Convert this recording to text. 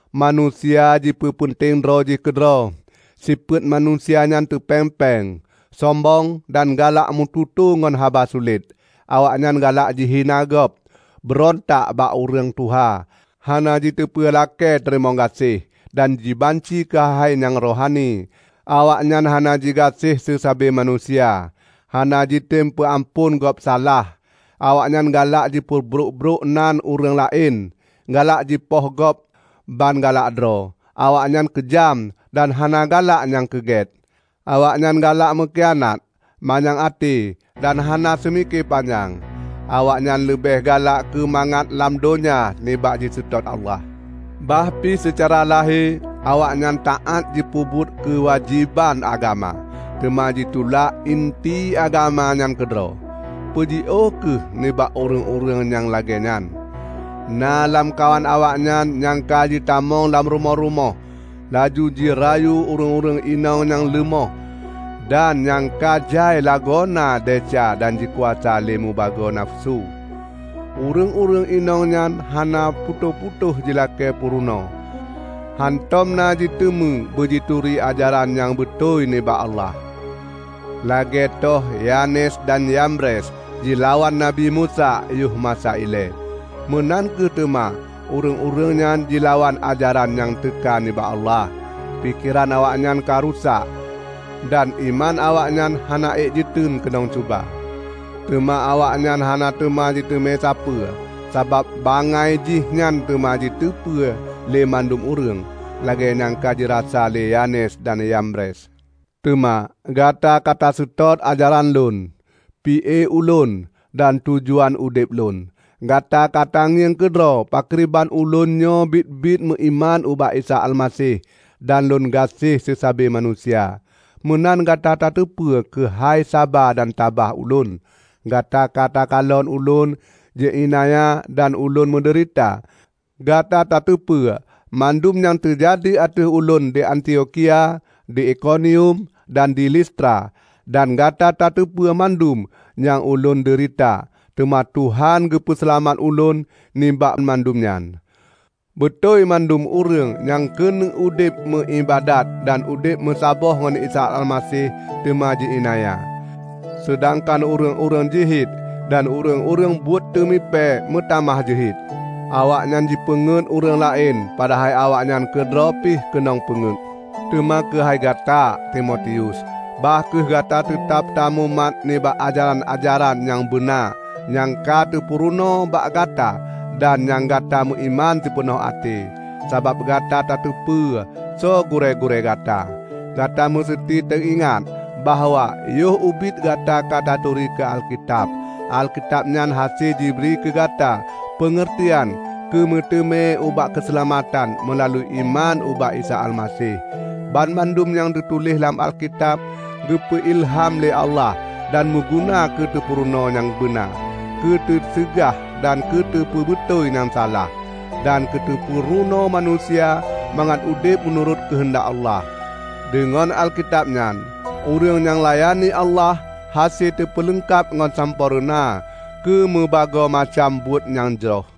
Manusia jipeupeunteng droe jih keudroe, sifeuet manusia nyan teupéng-péng, sombong dan galak meututoe ngon haba sulet. Awaknyan galak jihina gob, beurontak bak ureuëng tuha, hana jiteupeue lakée teurimong gaséh, dan jibanci keuhai-hai nyang rohani. Awaknyan hana jigaséh seusabe manusia, hana jitem peuamphon gob salah, awaknyan galak jipeubrok-brok nan ureuëng laén, galak jipoh gob ban galak droe, awaknyan keujam, dan hana galak nyang keugôt. Awaknyan galak meukianat, manyang até dan hana seumike panyang. Awaknyan leubeh galak keumangat lam donya nibak jiseutôt Allah. Bah pi seucara lahé awaknyan taát jipeubuet keuwajéban agama, teuma jitulak inti agama nyan keudroe. Peujiôh kheueh nibak ureuëng-ureuëng nyang lagée nyan. Na lamkawan awaknyan nyang ka jitamong lam rumoh-rumoh, laju jirayu ureuëng-ureuëng inong nyang leumoh dan nyang ka jai lagoena desya dan jikuasa lé mubagoe nafeusu. Ureuëng-ureuëng inong nyan hana putôh-putôh jilakée peurunoe, hántom na jiteume beujituri ajaran nyang beutôi nibak Allah. Lagée toh Yanes dan Yambres jilawan Nabi Musa yoh masa ilée, meunan kheueh teuma ureuëng-ureuëng nyan jilawan ajaran nyang teuka nibak Allah. Pikeran awaknyan ka rusak, dan iman awaknyan hana ék jiteun keunong cuba. Teuma awaknyan hana teuma jiteume sapeue, sabab bangai jih nyan teuma jiteupeue lé mandum ureuëng, lagée nyang ka jirasa lé Yanes dan Yambres. Teuma gata ka taseutôt ajaran lôn, pi-e ulôn, dan tujuan udeb lôn. Gata ka tangieng keudroe pakriban ulôn nyoe biet-biet meuiman ubak Isa Almaseh dan lôn gaséh seusabe manusia. Meunan gata tateupeue keuhai saba dan tabah ulôn. Gata ka takalon ulôn ji iénanya dan ulôn meudeurita. Gata tateupeue mandum nyang teujadi ateueh ulôn di Antiokhia, di Ikonium, dan di Listra; dan gata tateupeue banmandum nyang ulôn deurita! Teuma Tuhan geupeu seulamat ulôn nibak mandum nyan. Beutôi mandum ureuëng nyang keuneuk udeb meuiébadat dan udeb meusaboh ngon Isa Almaseh teuma ji iénanya, seudangkan ureuëng-ureuëng jeuhet dan ureuëng-ureuëng buet teumipée meutamah jeuhet. Awaknyan jipeungét ureuëng laén padahai awaknyan keudroe pih keunong peungeut. Teuma keuhai gata, Timotius, bah kheueh gata teutab tamumat nibak ajaran-ajaran nyang beuna nyang ka teupurunoe bak gata dan nyang gata meuiman sipeunoh até; sabab gata tateupeue soe gurée-gurée gata. Gata meuseuti teuingat bahwa yoh ubit gata ka taturi keu Alkitab. Alkitab nyan hase jibri keugata peungeurtian keumeuteumé ubak keuseulamatan meulalu iman ubak Isa Almaseh. Banmandum nyang teutuléh lam Alkitab, geupeu ilham lé Allah dan meuguna keuteupeurunoe nyang beuna, keuteuseugah dan teupeubeutôi nyang salah, dan keuteupeurunoe manusia mangat udeb meunurot keuheundak Allah. Deungon Alkitab nyan ureuëng nyang layani Allah hase teupeuleungkab ngon sampoereuna keumeubagoe macam buet nyang jroh.